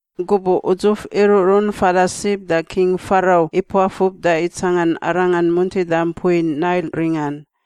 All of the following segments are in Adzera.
Gubuꞌ udzuf iruꞌrun fada sib da King Farau ipuafub da itsangan arangan muntida mpui Nail ringan,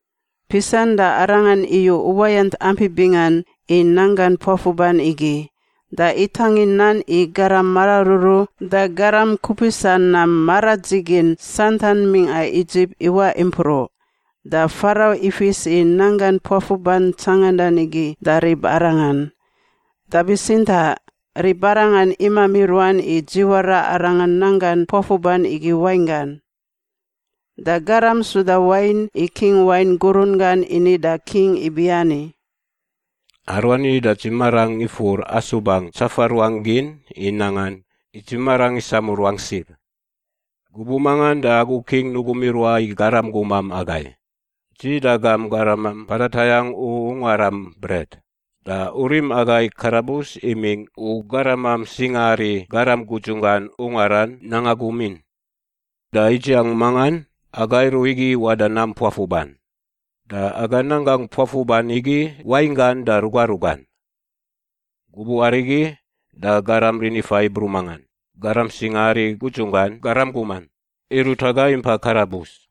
Pisan da arangan iyu uwayant ampi bingan i nanggan puafuban igi, da itangin nan i garam mararuru da garam kupisa nam maradzigin santan mingꞌa Idzip iwaꞌ impruꞌ. Da Farau ifis i nanggan puafuban tsangandan igi da ribarangan. Da bitsintaꞌ ribarangan imami ruan i dziwara arangan nanggan puafuban igi wainggan. Da garam suda wain i king wain gurun gan ini da king ibiani, “Aruani da dzi marangꞌ ifur asubangꞌ tsafa ruangꞌ gin i nangan, i dzi marangꞌ isamu ruangꞌ sib. Gubuꞌ mangan da agu King nugum iruaꞌ i garam guman agai, dzi da gam garaman mpada tayangꞌ u ungaram bret, da u rim agai i karabus imingꞌ u garamam singaari garam gudzunggan ungaran nanga gumin. Da idziang mangan aga iruꞌ igi iwaꞌ da nam puafuban, da aga nanggangꞌ puafuban igi wainggan da ruga rugan. Gubuꞌ arigi da garam rinifaꞌ Hibru mangan, garam singaari gudzunggan garam guman, irut agai impai karabus.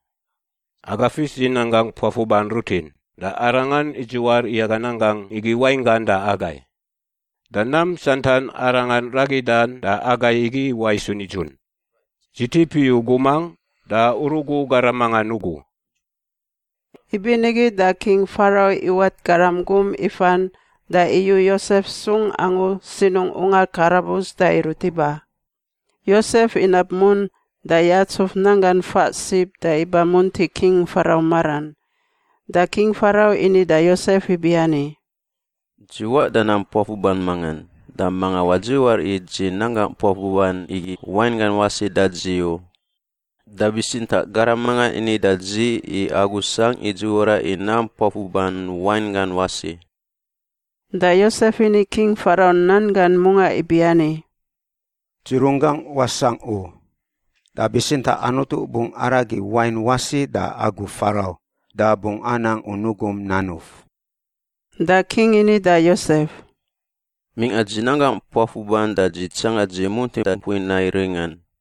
Aga fis i nanggangꞌ puafuban rutin da arangan idziwar i aga nanggangꞌ igi wainggan da agai. Da nam santan arangan ragidan da agai igi iwaꞌ isu nidzun. Dzi tip iyu gumangꞌ da u rugu garam mangan ugu.” Ibinigi da King Farau iwat garam gum ifan da iyu Yosef sung angu sinungꞌ ungar karabus da irut iba. Yosef inab mun da yatsuf nanggan faꞌ sib da iba munti King Farau maran. Da King Farau ini da Yosef ibiani, “Dzi waꞌ da nam puafuban mangan da manga wadziwar i dzi nanggangꞌ puafuban igi wainggan wasi da dzi u. Da bitsintaꞌ garam mangan ini da dzi i agu sangꞌ i dziwara i nam puafuban wainggan wasi.” Da Yosef ini King Farau nan gan mungaꞌ ibiani, “Dzi runggangꞌ wasangꞌ u, da bitsintaꞌ Anutu bungꞌ aragi wain wasi da agu Farau da bungꞌ anang u nugum nanuf.” Da king ini da Yosef, “Mingꞌa dzi nanggangꞌ puafuban da dzi tsangan dzi muntida mpui Nail ringan,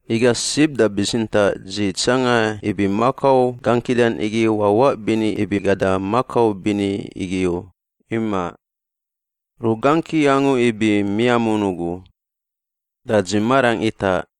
Iga sib da bitsintaꞌ dzi tsanga ibi makau gangkidan igi wawaꞌ bini ibi gada makau bini igi u. Imaꞌ. Rugangki angu ibi miamun ugu. Da dzi marangꞌ itaꞌ.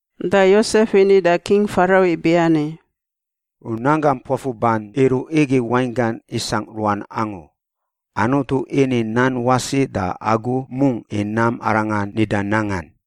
Da Yosef ini da King Farau ibiani, “U nanggam puafuban iruꞌ igi wainggan isangꞌ ruan angu. Anutu ini nan wasi da agu mungꞌ i nam arangan nida nangan.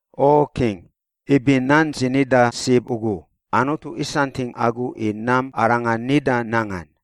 O king, ibi nan dzi nida sib ugu, Anutu isantingꞌ agu i nam arangan nida nangan.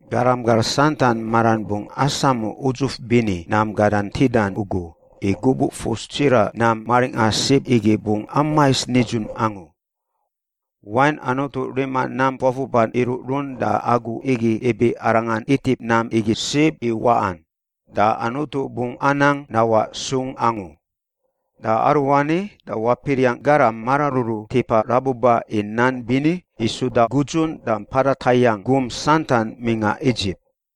Garam gar santan maran bungꞌ asamu udzuf bini nam gadan ntidan ugu i gubuꞌ fus tsiraꞌ nam maringꞌa sib igi bungꞌ amais nidzun angu. Wain Anutu rima nam puafuban iruꞌrun da agu igi ibi arangan itip nam igi sib i waꞌan, da Anutu bungꞌ anang nawaꞌ sung angu. Da aruani da wapiriangꞌ garam mararuru tipa rabuba i nan bini i suda gudzun da mpada tayangꞌ gum santan mingꞌa Idzip.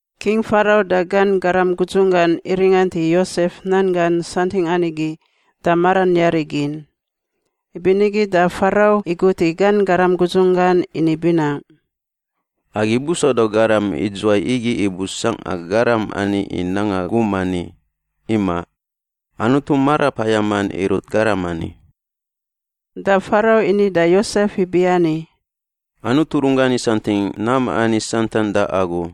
King Farau da gan garam gudzunggan iringant i Yosef nan gan santingꞌan igi da maran yari gin. Ibinigi da Farau igut i gan garam gudzun gan ini binaꞌ, “Agi busauda garam idzuwai igi i busangꞌa garam ani i nanga gum ani? Imaꞌ. Anutu Marapayaman irut garam ani.” Da Farau ini da Yosef ibiani, “Anutu runggan isantingꞌ nam ani santan da agu,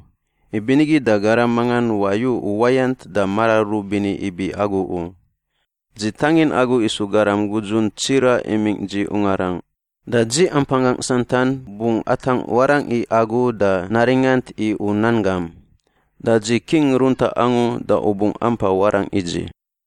ibinigi da garam mangan wayu uwayant da mararuru bini ibi agu u. Dzi tangin agu isu garam gudzun tsiraꞌ imingꞌ dzi ungarangꞌ, da dzi ampanggangꞌ santan bungꞌ atangꞌ warangꞌ i agu da naringant i u nan gam. Da dzi king runtaꞌ angu da u bungꞌ ampa warangꞌ i dzi.”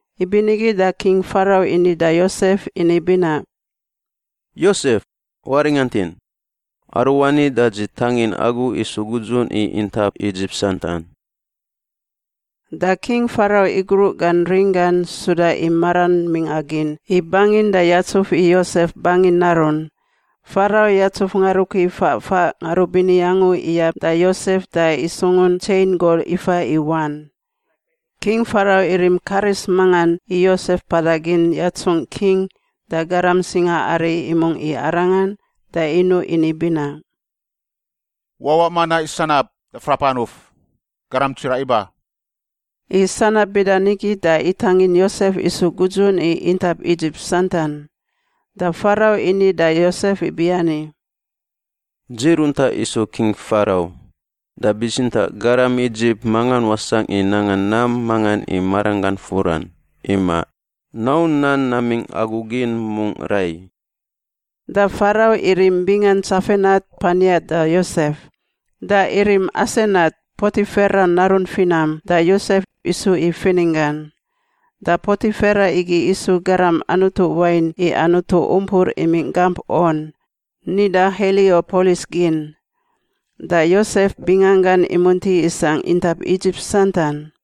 Ibinigi da King Farau ini da Yosef ini binaꞌ, “Yosef, waringantin. Aruani da dzi tangin agu isu gudzun i intap Idzip santan.” Da King Farau igruꞌ gan ring gan suda i maran mingꞌa gin i bangin da yatsuf i Yosef bangi narun. Farau yatsuf ngarukui faꞌ faꞌ ngarubini angu iyab da Yosef da isungun tsein gol ifa i wan. King Farau irim karis mangan i Yosef mpada gin yatsungꞌ king da garam singaari imungꞌ i arangan da inuꞌ ini binaꞌ, “Wawaꞌ manaꞌ i sanab da frap anuf! Garam tsiraꞌ iba!” I sanab bida nigi da itangin Yosef isu gudzun i intap Idzip santan. Da Farau ini da Yosef ibiani, “Dzi runtaꞌ isu King Farau, da bitsintaꞌ garam Idzip mangan wasangꞌ i nanga nam mangan i maranggan furan. Imaꞌ. Nau nan namingꞌ agu gin mungꞌ rai.” Da Farau irim bingan Tsafenat Pania da Yosef. Da irim Asenat, Potifera narun finam, da Yosef, isu i fininggan. (Da Potifera igi isu garam anutu wain i anutu umpur imingꞌ gamp On, nida Heliopolis gin.) Da Yosef binganggan imunti isangꞌ intap Idzip santan.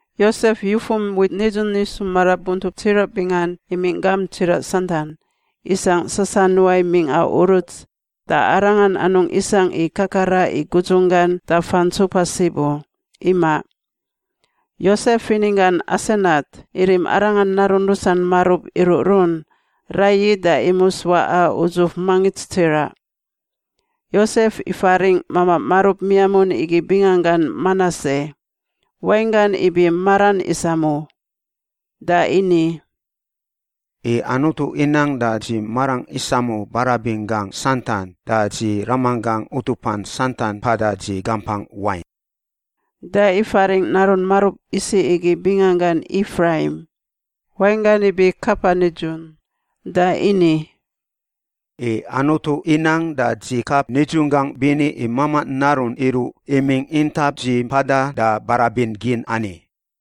Yosef yufum wit nidzun isu marabuntup tsiraꞌ bingan imingꞌ gamp tsiraꞌ santan, isangꞌ sasanuai mingꞌa uruts, da arangan anungꞌ isangꞌ i kakara i gudzunggan da fantsupa sib u. Imaꞌ. Yosef fininggan Asenat irim arangan narun rusan marub iruꞌrun raiyi da imus waꞌa udzuf mangits tsiraꞌ. Yosef ifaringꞌ mamaꞌ marub miamun igi binganggan Manase (wainggan ibi maran isamu), da ini, “I Anutu inang da dzi marangꞌ isamu barabin gangꞌ santan da dzi ramanggangꞌ utupan santan mpada dzi gampangꞌ wain.” Da ifaringꞌ narun marub isiꞌ igi binganggan Ifraim (wainggan ibi kapa nidzun) da ini, “I Anutu inang da dzi kap nidzunggangꞌ bini i mamaꞌ narun iruꞌ imingꞌ intap dzi mpada da barabin gin ani.”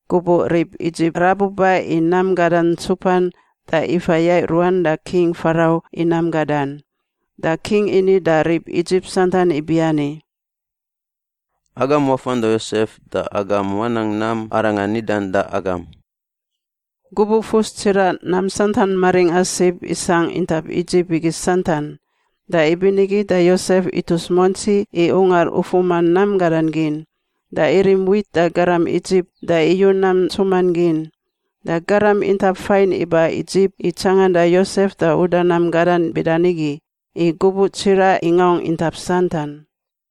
Gubuꞌ rib Idzip rabuba i nam gadan ntsupan da ifa yaiꞌ ruan da King Farau i nam gadan. Da king ini da rib Idzip santan ibiani, “Agam wafan da Yosef da agam wanang nam arangan nidan da agam.” Gubuꞌ fus tsiraꞌ nam santan maringꞌa sib isangꞌ intap Idzip igi santan. Da ibinigi da Yosef itus muantsi i ungar ufuma nam gadan gin, da irim wit da garam Idzip da iyu nam ntsuman gin. Da garam intap fain iba Idzip i tsanganda Yosef da uda nam gadan bida nigi, i gubuꞌ tsiraꞌ ingaungꞌ intap santan.